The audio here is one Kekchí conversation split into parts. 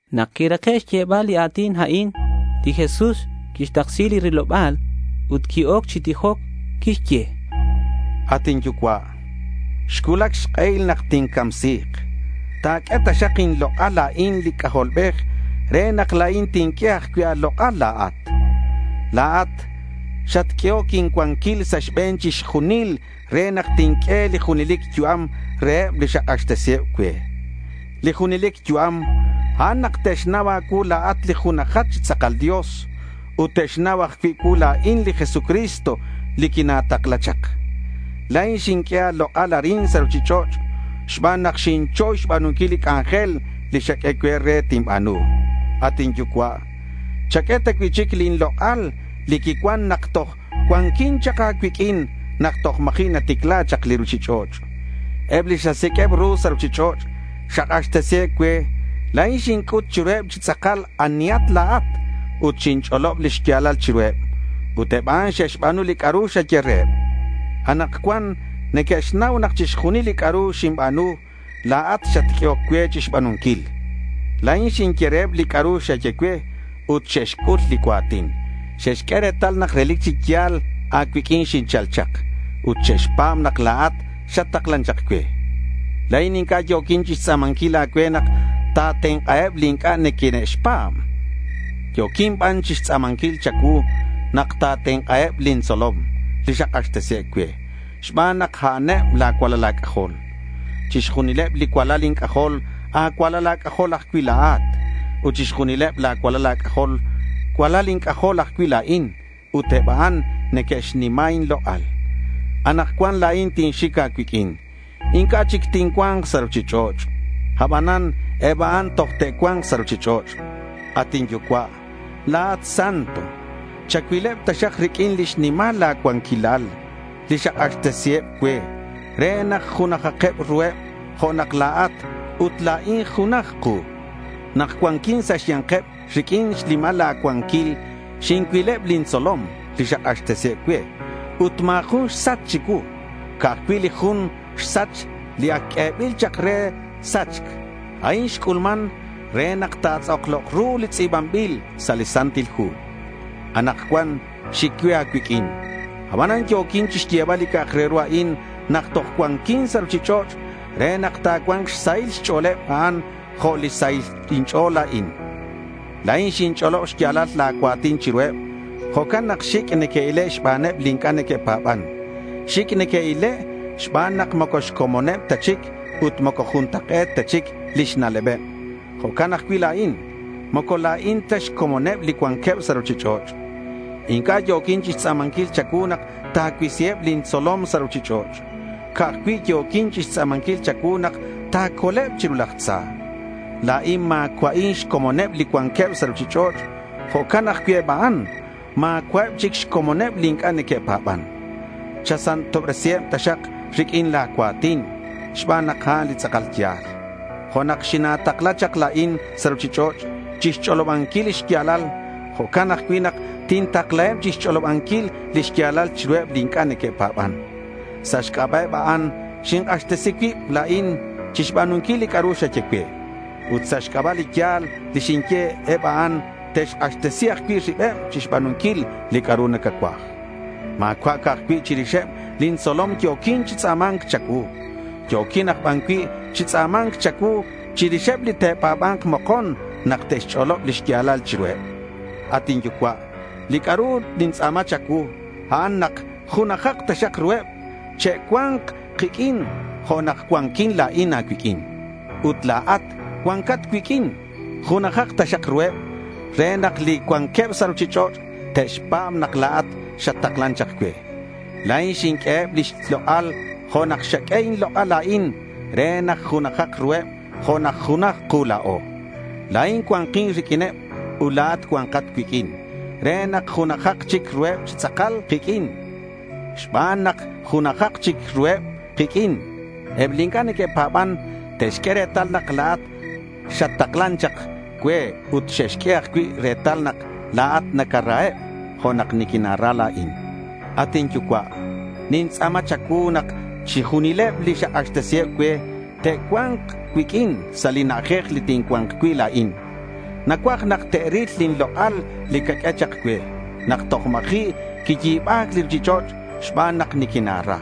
Nak quirake' xyebal li a̱tin a'in, li Jesús quixtaksi li riloba̱l ut qui-oc chi tijoc. Quixye: —At inYucua', xcuulac xk'ehil nak tincamsi̱k. Ta̱q'ue taxak inlok'al la̱in li C'ajolbej re nak la̱in tinq'ue ajcui' a̱lok'al la̱at. La̱at xatq'uehoc incuanquil sa' xbe̱n chixjunil re nak tinq'ue li junelic yu'am reheb li xak'axtesiheb cue. Li junelic yu'am, a'an nak te'xnau a̱cuu la̱at li junajat chi tz'akal Dios ut te'xnau ajcui' cuu la̱in li Jesucristo li quina̱takla chak. La̱in xinq'ue a̱lok'al arin sa' ruchich'och' xban nak xinchoy xba̱nunquil li c'anjel li xaq'ue cue re tinba̱nu. At inYucua', chaq'ue ta cui'chic lin lok'al li quicuan nak toj cuanquin chak a̱cuiq'uin nak toj ma̱ji' naticla chak li ruchich'och'. Eb li xasiq'ueb ru sa' ruchich'och' xak'axtesiheb cue. La̱in xinc'ut chiruheb chi tz'akal anihat la̱at ut xinch'olob li xya̱lal chiruheb. Ut eb a'an xe'xba̱nu li c'a'ru xaye reheb. Anakcuan neque'xnau nak chixjunil li c'a'ru xinba̱nu, la̱at xatq'uehoc cue chixba̱nunquil. La̱in xinye reheb li c'a'ru xaye cue ut xe'xc'ul li cua̱tin. Xe'xq'ue retal nak relic chi ya̱l a̱cuiq'uin xinchal chak ut xe'xpa̱b nak la̱at xattaklan chak cue. La̱in inc'a' yo̱quin chixtz'a̱manquil a̱cue nak ta̱tenk'aheb li inc'a' xine'xpa̱b. Yo̱quin ban chixtz'a̱manquil cha̱cuu nak ta̱tenk'aheb lin tzolom li xak'axtesiheb cue xban nak a'aneb la̱ cualal a̱c'ajol. Chixjunileb li cualal inc'ajol, a̱cualal a̱c'ajol ajcui' la̱at. Ut chixjunileb la̱ cualal a̱c'ajol, cualal inc'ajol ajcui' la̱in. Ut eb a'an neque'xnima inlok'al. Anakcuan la̱in tinxic a̱cuiq'uin. Inc'a' chic tincua̱nk sa' ruchich'och'. Abanan eb a'an toj te'cua̱nk sa' ruchich'och'. At inYucua', la̱at Santo. Chacuileb taxak riq'uin lix nimal la̱ cuanquilal li xak'axtesiheb cue re nak junajak ruheb jo' la̱at ut la̱in junaj ku. Nak cuanquin sa' xya̱nkeb, riq'uin xnimal la̱ cuanquil xincuileb lin tzolom li xak'axtesiheb cue ut ma̱ jun xsach chicuu. Ca'aj cui' li jun xsach li ac q'uebil chak re sachc. A'in xc'ulman re nak ta̱tz'aklok ru li tz'i̱banbil sa' li Santil Hu. Anakcuan xic cue a̱cuiq'uin. Abanan yo̱quin chixyebal li c'a'ak re ru a'in nak toj cuanquin sa' ruchich'och' re nak ta̱cua̱nk xsahil xch'o̱leb a'an jo' li xsahil inch'o̱l la̱in. La̱in xinch'olob xya̱lal la̱ cua̱tin chiruheb. Jo'can nak xic' neque'ile' xbaneb li inc'a' neque'pa̱ban. Xic' neque'ile' xban nak moco xcomoneb ta chic ut moco juntak'e̱t ta chic lix na'lebeb. Jo'can ajcui' la̱in. Moco la̱in ta xcomoneb li cuanqueb sa' ruchich'och'. Inc'a' yo̱quin chixtz'a̱manquil cha̱cuu nak ta̱cuisiheb lin tzolom sa' ruchich'och'. Ca'aj cui' yo̱quin chixtz'a̱manquil cha̱cuu nak ta̱coleb chiru laj tza. La̱in ma̱cua'in xcomoneb li cuanqueb sa' ruchich'och'. Jo'can ajcui' eb a'an. Ma̱cua'eb chic xcomoneb li inc'a' neque'pa̱ban. Chasantobresiheb taxak riq'uin la̱ cua̱tin, xban nak a'an li tz'akal ya̱l. Jo' nak xina̱takla chak la̱in sa' ruchich'och' chixch'olobanquil li xya̱lal, jo'can ajcui' nak tintaklaheb chixch'olobanquil li xya̱lal chiruheb li inc'a' neque'pa̱ban. Sa' xc'aba' eb a'an xink'axtesi cuib la̱in chixba̱nunquil li c'a'ru xaye cue. Ut sa' xc'aba' li ya̱l li xinye eb a'an te'xk'axtesi ajcui' ribeb chixba̱nunquil li c'a'ru nacacuaj. Ma̱cua' ca'aj cui' chirixeb lin tzolom yo̱quin chi tz'a̱ma̱nc cha̱cuu. Yo̱quin aj ban cui' chi tz'a̱ma̱nc cha̱cuu chirixeb li te'pa̱ba̱nk mokon nak te'xch'olob li xya̱lal chiruheb. At inYucua', li c'a'ru nintz'a̱ma cha̱cuu, a'an nak junajak taxak ruheb. Che'cua̱nk kiq'uin jo' nak cuanquin la̱in a̱cuiq'uin ut la̱at cuancat cuiq'uin. Junajak taxak ruheb re nak li cuanqueb sa' ruchich'och' te'xpa̱b nak la̱at xattaklan chak cue. La̱in xinq'ueheb lix lok'al jo' nak xaq'ue inlok'al la̱in re nak junajak ruheb jo' nak junaj ku la̱o. La̱in cua̱nkin riq'uineb ut la̱at cua̱nkat cuiq'uin re nak junajak chic ruheb chi tz'akal kiq'uin. Ut xban nak junajak chic ruheb kiq'uin, eb li inc'a' neque'pa̱ban te'xq'ue retal nak la̱at xattaklan chak cue ut te'xq'ue ajcui' retal nak la̱at nacaraheb jo' nak niquina̱ra la̱in. At inYucua', nintz'a̱ma cha̱cuu nak chixjunileb li xak'axtesiheb cue te'cua̱nk cuiq'uin sa' li na'ajej li tincua̱nk cui' la̱in. Nacuaj nak te'ril lin lok'al li caq'ue chak cue nak toj ma̱ji' quiyi̱ba̱c li ruchich'och' xban nak niquina̱ra.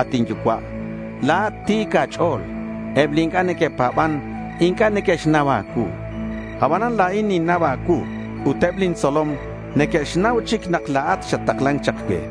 At inYucua', la̱at ti̱c a̱ch'o̱l. Eb li inc'a' neque'pa̱ban inc'a' neque'xnau a̱cuu. Abanan la̱in ninnau a̱cuu ut eb lin tzolom neque'xnau chic nak la̱at xattaklan chak cue.